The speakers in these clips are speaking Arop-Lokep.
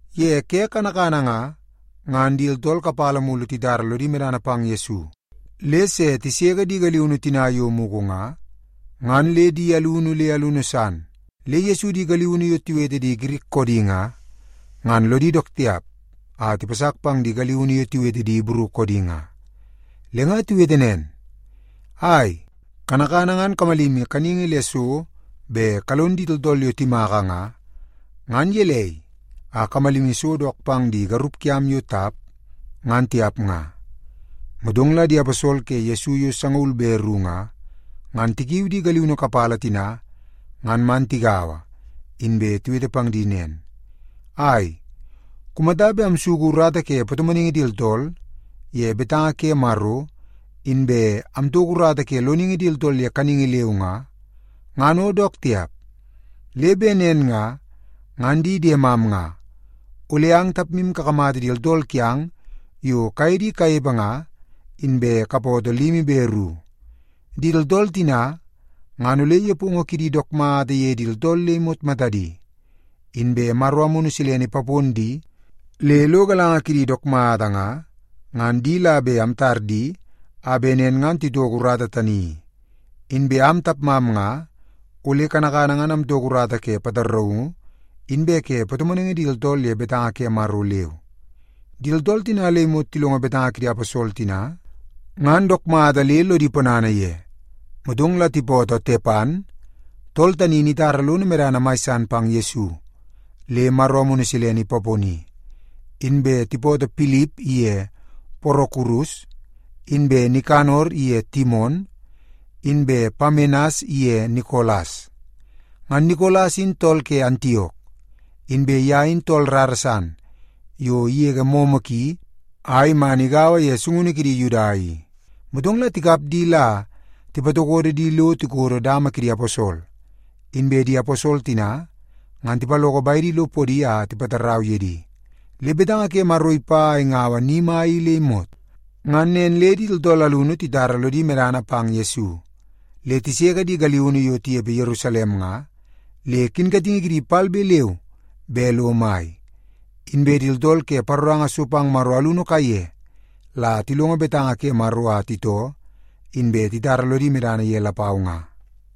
Ye ke kanakana nga, ngan di tooltool kapala mulu titara lodi medana pang Yesu le se tiseke di galiunu tina yo mugu nga, ngan le di alunu le alunu san. Le Yesu di galiunu yo tiwete di Girik koodi nga, ngan lodi dook tiap a tipasak pang di galiunu yo tiwete di Ibru koodi nga. Le nga tiwete nen, “Ai, kanakana ngan kamalimi kaningi le so bet kalon di tooltool yo timaka nga, ngan gelei a kamalimi so dook pang di garup kiam yo tap, ngan tiap nga?” Motong la di aposol ke Yesu yo sangaul be ru nga, ngan tikiu di galiunu kapala tina ngan man tigaua, inbe tiwete pang di nen, “Ai, kumata bet amsuku urata ke patomonaingi di tooltool ye betanga ke Maro, inbe amtoko urata ke loningi di tooltool ye kaningi leu nga, ngan o dook tiap. Le bet nen nga, ngan di diemam nga, ole ang tapmu kakamata di tooltool kiang yo kaye di kanepe nga, inbe kapootoo limi be ru. Di tooltool tina ngan ole nepongo kidi dook mata ye di tooltool le imot matadi, inbe Maro Amunu Silene ipapon di le lo galanga kidi dook mata nga, ngan di la bet amtar di a bet nen ngan titoko urata tani i. Inbe am tapmam nga ole kanakana ngan amtoko urata ke pataraungu inbe ke patomonaingi di tooltool ye betanga ke Maro leu.” Di tooltool tina le imot tilongo betanga kidi aposol tina, ngan dook mata le lodi ponana ye. Motong la tipootoo Tepan, tool tani in itara lono medana mai san pang Yesu le Maro Amunu Silene ipaponi. Inbe tipootoo Pilip iye Porokurus, inbe Nikanor iye Timon, inbe Pamenas iye Nikolas. Ngan Nikolas in tool ke Antiok, inbe ye in tool rara san yo igege momo ki a iman igaua ye sungunu kidi Yuda i. Motong la tikap di la tipatokodo di lo tikodo dama kidi aposol, inbe di aposol tina ngan tipaloko bedi lo podi a tipatarau ye di. Le betanga ke Maro ipa a ingaua ni mai i le imot. Ngan nen le di tooltool alunu titara lodi medana pang Yesu, le tiseke di galiunu yo tinepe Yerusalem nga, le kinkatingi kidi palbe leu be lo mai. Inbe di tooltool ke paroranga so pang Maro alunu kaiye la tilongo betanga ke Maro a titoo, inbe titara lodi medana ye lapau nga.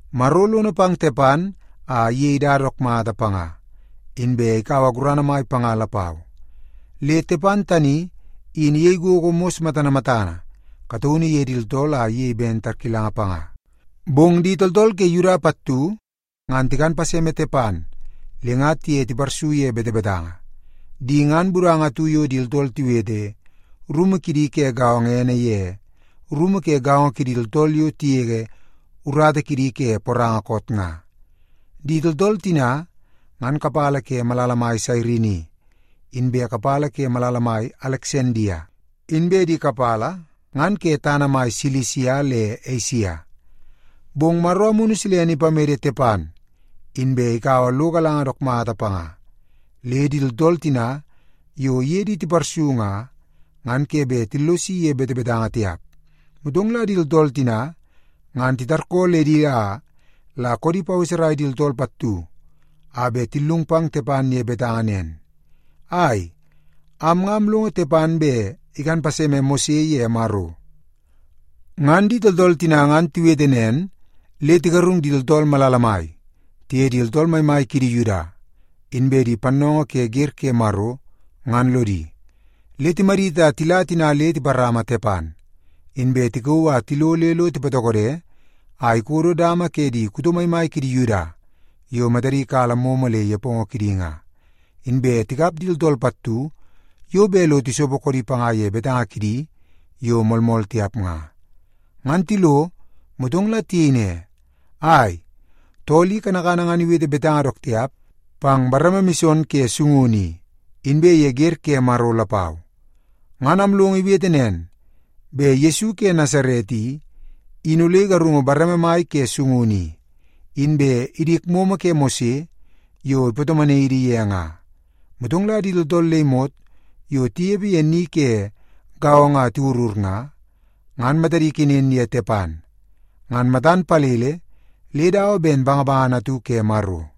Maro lono pang Tepan a iyei dada dook mata panga, inbe ikaua gurana mai panga lapau. Le Tepan tani in iyei gogo mos matana matana kataunu ye di tooltool a iyei ben tarkilanga panga. Bong di tooltool ke Yuda pattu ngan tikan paseme Tepan le nga tiye tiparsu ye betebetanga. Di ngan budanga atu yo di tooltool tiwete rumu kidi ke gaongo ene ye Rumu Ke Gaongo Kidi Tooltool Yo Tigege Urata Kidi Ke Poranga Koot nga. Di tooltool tina ngan kapala ke malala mai Sairini, inbe kapala ke malala mai Aleksandia, inbe di kapala ngan ke tana mai Silisia le Esia. Bong Maro Amunu Silene ipamede Tepan, inbe ikaua lo galanga dook mata panga, le di tooltool tina yo iye di tiparsu nga, ngan ke bet tillosi ye betebetanga tiap. Motong la di tooltool tina ngan titarkooledi a la koodi paweserai di tooltool pattu a bet tillung pang Tepan ye betanga nen, “Ai, am nga amlongo Tepan bet ikan paseme Mose ye Maro.” Ngan di tooltool tina ngan tiwete nen, le tigarung di tooltool malala mai, tiye di tooltool maimai kidi Yuda, inbe di pannoongoo ke wer ke Maro, ngan lodi. Le timadit a tila tina le tiparama Tepan, inbe tikauu a tilo le lo tipatokode a ikodo dama ke di kuto maimai kidi Yuda yo matadi kala momo le nepongo kidi nga. Inbe tikap di tooltool pattu yo bet lo tisopo koodi panga ye betanga kidi yo moolmool tiap nga. Ngan tilo, motong la tiyei ne, “Ai, tool i kanakana ngan iwete betanga dook tiap pang bareme mison ke sungunu i, inbe ye wer ke Maro lapau. Ngan amlongo iwete nen, bet Yesu ke Nasaret i, in ole igarungu bareme mai ke sungunu i, inbe idik momo ke Mose yo ipatomonai idi ye nga.” Motong la di tooltool le imot yo tinepe ye ni ke gaongo a tiwurur nga, ngan matadi ikenen ye Tepan, ngan matan palele le dawa ben bangabangana atu ke Maro.